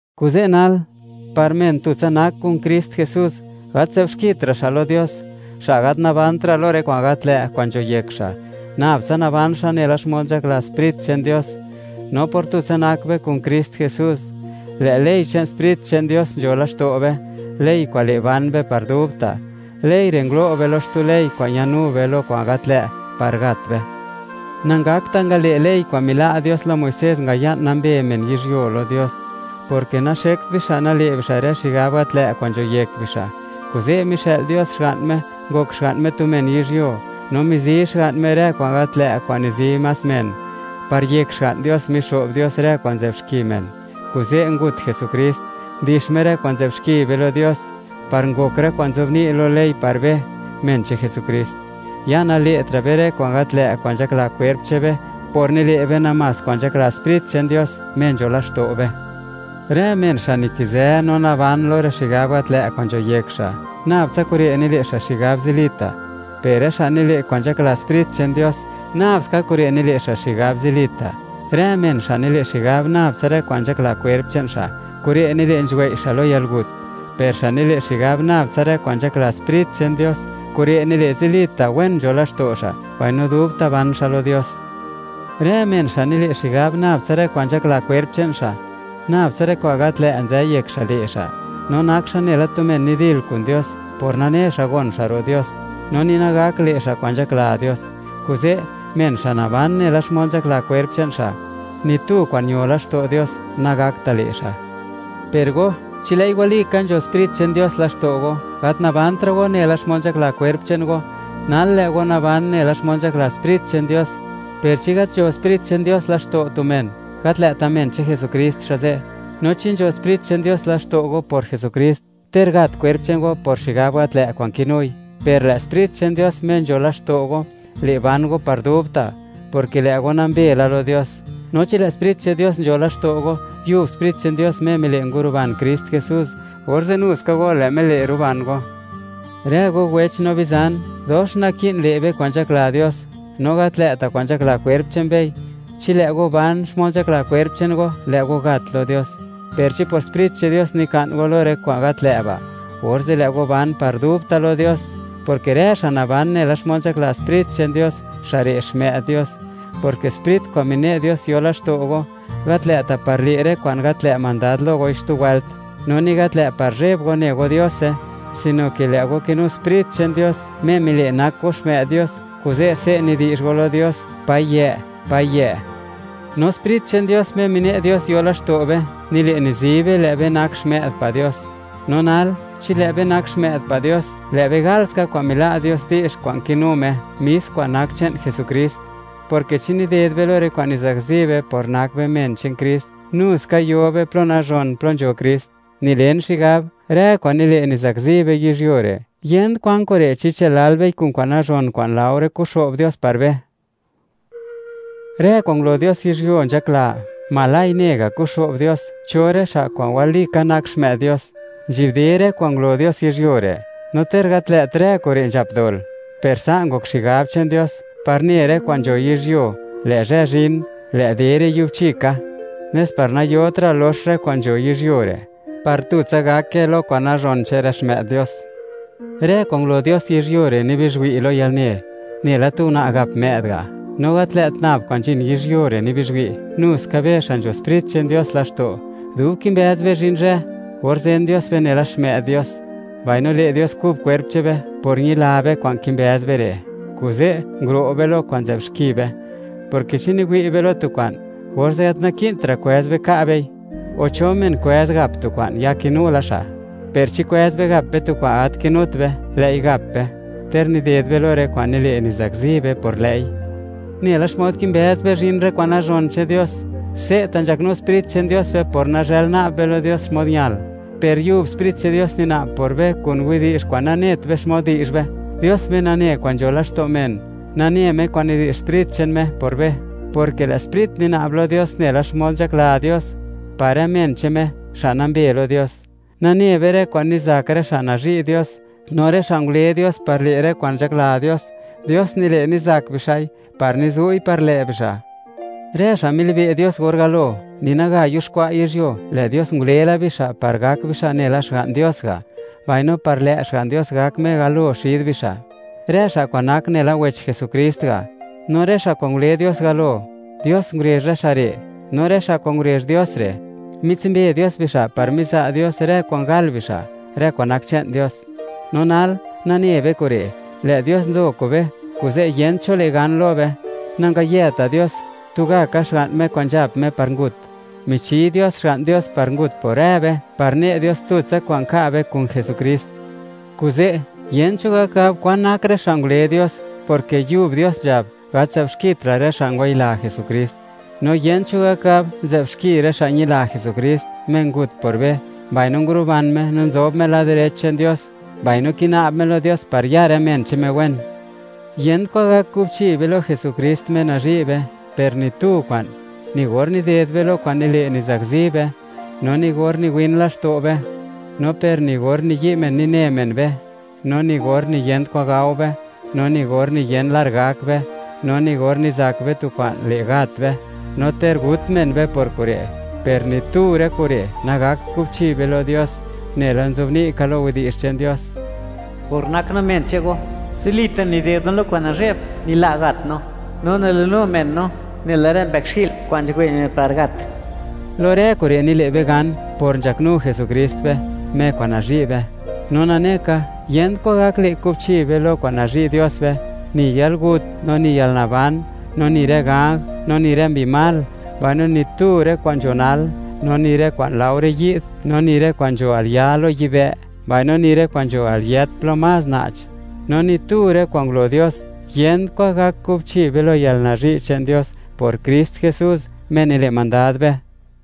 Kuze' nal, par men tutsa nak kun Krist Jesús, gat nzë'b xkitra' xa' lo Dios, xa' gat nabantra' lo rë kwa'n gat lë' kwa'n nzho yek xa'; nab tsa naban xa' nela xmod nzhakla Sprit che'n Dios. No por tutsa nak be kun Krist Jesús, lë' ley che'n Sprit che'n Dios nzho laxto' be, ley kwa'n le', ban be par dubta'. Ley re' ngulo' be lo xtu ley kwa'n ñanu be lo kwa'n gat lë' par gat be. Nangakta' ngale' ley kwa'n mila' Dios lo Muisés ngaya'n nambe men yizhyuo lo Dios, porke naxekt bixa' nale' bixa' rë xigab gat lë' kwa'n nzho yek bixa'. Kuze' mixë'l Dios Xga'n Me, ngok Xga'n Me tu men yizhyuo, no mizi Xga'n Me rë kwa'n gat lë' kwa'n nizi más rë men. Par yek Xga'n Dios, mixo'b Dios rë kwa'n nzë'b xki men, kuze' ngut Jesukrist, ndix Me rë kwa'n nzë'b xki be lo Dios, par ngok rë kwa'n nzobni' lo ley par be, men che'n Jesukrist. Ya nale'tra' be rë kwa'n gat lë' kwa'n nzhakla kwerp che'n be, por nile' be namás kwa'n nzhakla Sprit che'n Dios, Me nzho laxto' be. Rë men xa' nikizë no naban lo rë xigab gat lë' kwa'n nzho yek xa', nab tsa kure' nile' xa' xigab zilita'; per rë xa' nile' kwa'n nzhakla Sprit che'n Dios, nabska kure' nile' xa' xigab zilita'. Rë men xa' nile' xigab nab tsa rë kwa'n nzhakla kwerp che'n xa', kure' nile' nzhuwei' xa' lo yalgut; per xa' nile' xigab nab tsa rë kwa'n nzhakla Sprit che'n Dios, kure' nile' zilita' wen nzho laxto' xa', mbaino dubta' ban xa' lo Dios. Rë men xa' nile' xigab nab tsa rë kwa'n nzhakla kwerp che'n xa', nab tsa rë kwa'n gat lë' nzë yek xa' le' xa', no nak xa' nela tu men nidil kun Dios, por nane xa' gon xa' ro' Dios, no ni nagak le' xa' kwa'n nzhakla Dios. Kuze', men xa' naban nela xmod nzhakla kwerp che'n xa', ni tu kwa'n ño laxto' Dios nagakta' le' xa'. Per go, chi lë'i walika nzho Sprit che'n Dios laxto' go, gat nikizëtra' go nela xmod nzhakla kwerp che'n go, nal lë' go naban nela xmod nzhakla Sprit che'n Dios; per chi gat nzho Sprit che'n Dios laxto' tu men, gat lë'ta' men che'n Jesukrist xa' ze'. No chi nzho Sprit che'n Dios laxto' go por Jesukrist, ter gat kwerp che'n go por xigab gat lë' kwa'n kinui, per lë' Sprit che'n Dios, Me nzho laxto' go, le' ban go par dubta', porke lë' go nambe la lo Dios. No chi lë' Sprit che'n Dios nzho laxto' go, yub Sprit che'n Dios Me mile' nguruban Krist Jesús, orze' nu ska go lë' Me le' ruban go. Rë go wech no bizan, dox naki'n le' be kwa'n nzhakla Dios, no gat lë'ta' kwa'n nzhakla kwerp che'n bei. Chi lë' go ban xmod nzhakla kwerp che'n go, lë' go gat lo Dios; per chi por Sprit che'n Dios nika'n go lo rë kwa'n gat lë' ba', orze' lë' go ban par dubta' lo Dios, porke rë xa' naban nela xmod nzhakla Sprit che'n Dios, xa' re' xmë'd Dios, porke Sprit kwa'n mine' Dios yo laxto' go, gat lë'ta' par le' rë kwa'n gat lë' mandad lo goi xtu wëlt, no ni gat lë' par zheb go ne go Diose; sino ke lë' go kinu Sprit che'n Dios Me mile' nak go xmë'd Dios, kuze' se' nidi'zh go lo Dios: “¡Payë', Payë'!” No Sprit che'n Dios Me mine' Dios yo laxto' be, nile', nizi be, lë' be nak xmë'd pa' Dios. No nal, chi lë' be nak xmë'd pa' Dios, lë' be galska kwa'n mila' Dios di'zh kwa'n kinu Me, mis kwa'n nak che'n Jesukrist; porke chi nided be lo rë kwa'n nizakzi be por nak be men che'n Krist, nu ska yo be plo nazhon, plo nzho Krist. Nilen xigab, rë kwa'n nile' nizakzi be yizhyuo re', yent kwan kure' chi chë'l lal bei kun kwa'n nazhon kwa'n laore kuxo'b Dios par be. Rë kwa'n ngulo Dios yizhyuo nzhakla, oj ne ga' kuxo'b Dios, cho rë xa' kwa'n walika nak xmë'd Dios. Nzhi'bde rë kwa'n ngulo Dios yizhyuo re', no ter gat lë't rë kure' nzhap dol, per sa' ngok xigab che'n Dios, par ne rë kwa'n nzho yizhyuo, lë' zhë zhin, lë' de re' yubchi ka; nes par nayotra' lox rë kwa'n nzho yizhyuo re', par tutsa gake lo kwa'n nazhon che'n rë xmë'd Dios. Rë kwa'n ngulo Dios yizhyuo re', nibizhwi' lo yalne, nela tu una' gap më'd ga'. No gat lë't nab kwa'n nzhin yizhyuo re' nibizhwi', nu ska be xa' nzho Sprit che'n Dios laxto', dub kimbëz be zhin zhë, or zen Dios be nela xmë'd Dios, mbaino le' Dios kub kwerp che'n be. Por ñila be kwa'n kimbëz be re', kuze', nguro' be lo kwa'n nzë'b xki be, porke chi niwi' be lo tu kwa'n, orze' gat naki'ntra' kwëz be ka' bei. O, ¿cho men kwëz gap tu kwa'n, ya kinu la xa'? Per chi kwëz be gap be tu kwa'n gat kinut be, lë'i gap be, ter nided be lo rë kwa'n nile' nizakzi be por lë'i. Nela xmod kimbëz be zhin rë kwa'n nazhon che'n Dios, se'ta nzhaknu Sprit che'n Dios be por nazhël na'b be lo Dios xmod ñal; per yub Sprit che'n Dios nina'b por be kun widi'zh kwa'n nanet be xmod di'zh be. Dios Me nane kwan nzho laxto' men, nane Me kwan nidi'zh Sprit che'n Me por be, porke lë' Sprit nina'b lo Dios nela xmod nzhakla Dios par rë men che'n Me, xa' nambe lo Dios. Nane be, rë kwa'n nizak rë xa' nazhi' Dios, no rë xa' ngule Dios par le' rë kwa'n nzhakla Dios, Dios nile' nizak bixa'i, par nizu'i par lë' bixa'. Rë xa' milibe' Dios or galo, ni naga yuxkwa' yizhyuo, lë' Dios ngule la bixa' par gak bixa' nela Xga'n Dios ga', mbaino par lë' Xga'n Dios gak Me galo xid bixa', rë xa' kwa'n nak nela wech Jesukrist ga'. No rë xa' kwa'n ngule Dios galo, Dios ngurezh rë xa' re'; no rë xa' kwa'n ngurezh Dios re', mitsumbe Dios bixa' par miza' Dios rë kwa'n gal bixa', rë kwa'n nak che'n Dios. No nal, nane be kure', lë' Dios nzo kube, kuze' yent cho le' gan lo be. Nangayeta' Dios tugaka Xga'n Me kwa'n nzhap Me par ngut; mine' Dios Xga'n Dios par ngut Me por rë be, par ne' Dios tutsa kwa'n ka' be kun Jesukrist. Kuze', yent cho gak gab kwa'n nak rë xa' ngule Dios, porke yub Dios nzhab: “Gat nzë'b xkitra' rë xa' ngwayila Jesukrist.” No yent cho gak gab, nzë'b xki rë xa' ñila Jesukrist, Me ngut por be, mbaino nguruban Me no nzob Me lad direch che'n Dios, mbaino kina'b Me lo Dios par ya rë men che'n Me wen. Yent kwan gak kubchi be lo Jesukrist, Me nazhi' be. Per ni tu kwa'n, ni gor nided be lo kwa'n nile' nizakzi be; no ni gor niwin laxto' be, no per ni gor niyi' men nine men be, no ni gor niyent kwa'n gao be, no ni gor niyen lar gak be, no ni gor nizak be tu kwa'n le' gat be, no ter gut men be por kure'. ¡Per ni tu rë kure' nagakt kubchi be lo Dios! Nela nzobni' ka lo Yech che'n Dios: Por nak no men che'n Go, zilita' nided no lo kwa'n nazhe'b nila' gat no; no nilinu men no nela rë mbëkxi'l kwa'n nzhuwei' men par gat. Lo rë kure' nile' be gan, por nzhaknu Jesukrist be, Me kwa'n nazhi' be. Na nane ka, yent kwan gak le' kubchi be lo kwa'n nazhi' Dios be: Ni yalgut no ni yalnaban, no ni rë ganj, no ni rë mbi mal; mbaino ni tu rë kwa'n nzho nal, no ni rë kwa'n laore yi'd; no ni rë kwa'n nzho al ya' lo yibë', mbaino ni rë kwa'n nzho al yët plo más na'ch; no ni tu rë kwa'n ngulo Dios. Yent kwa'n gak kubchi be lo yalnazhi' che'n Dios por Krist Jesús, Me nile' mandad be.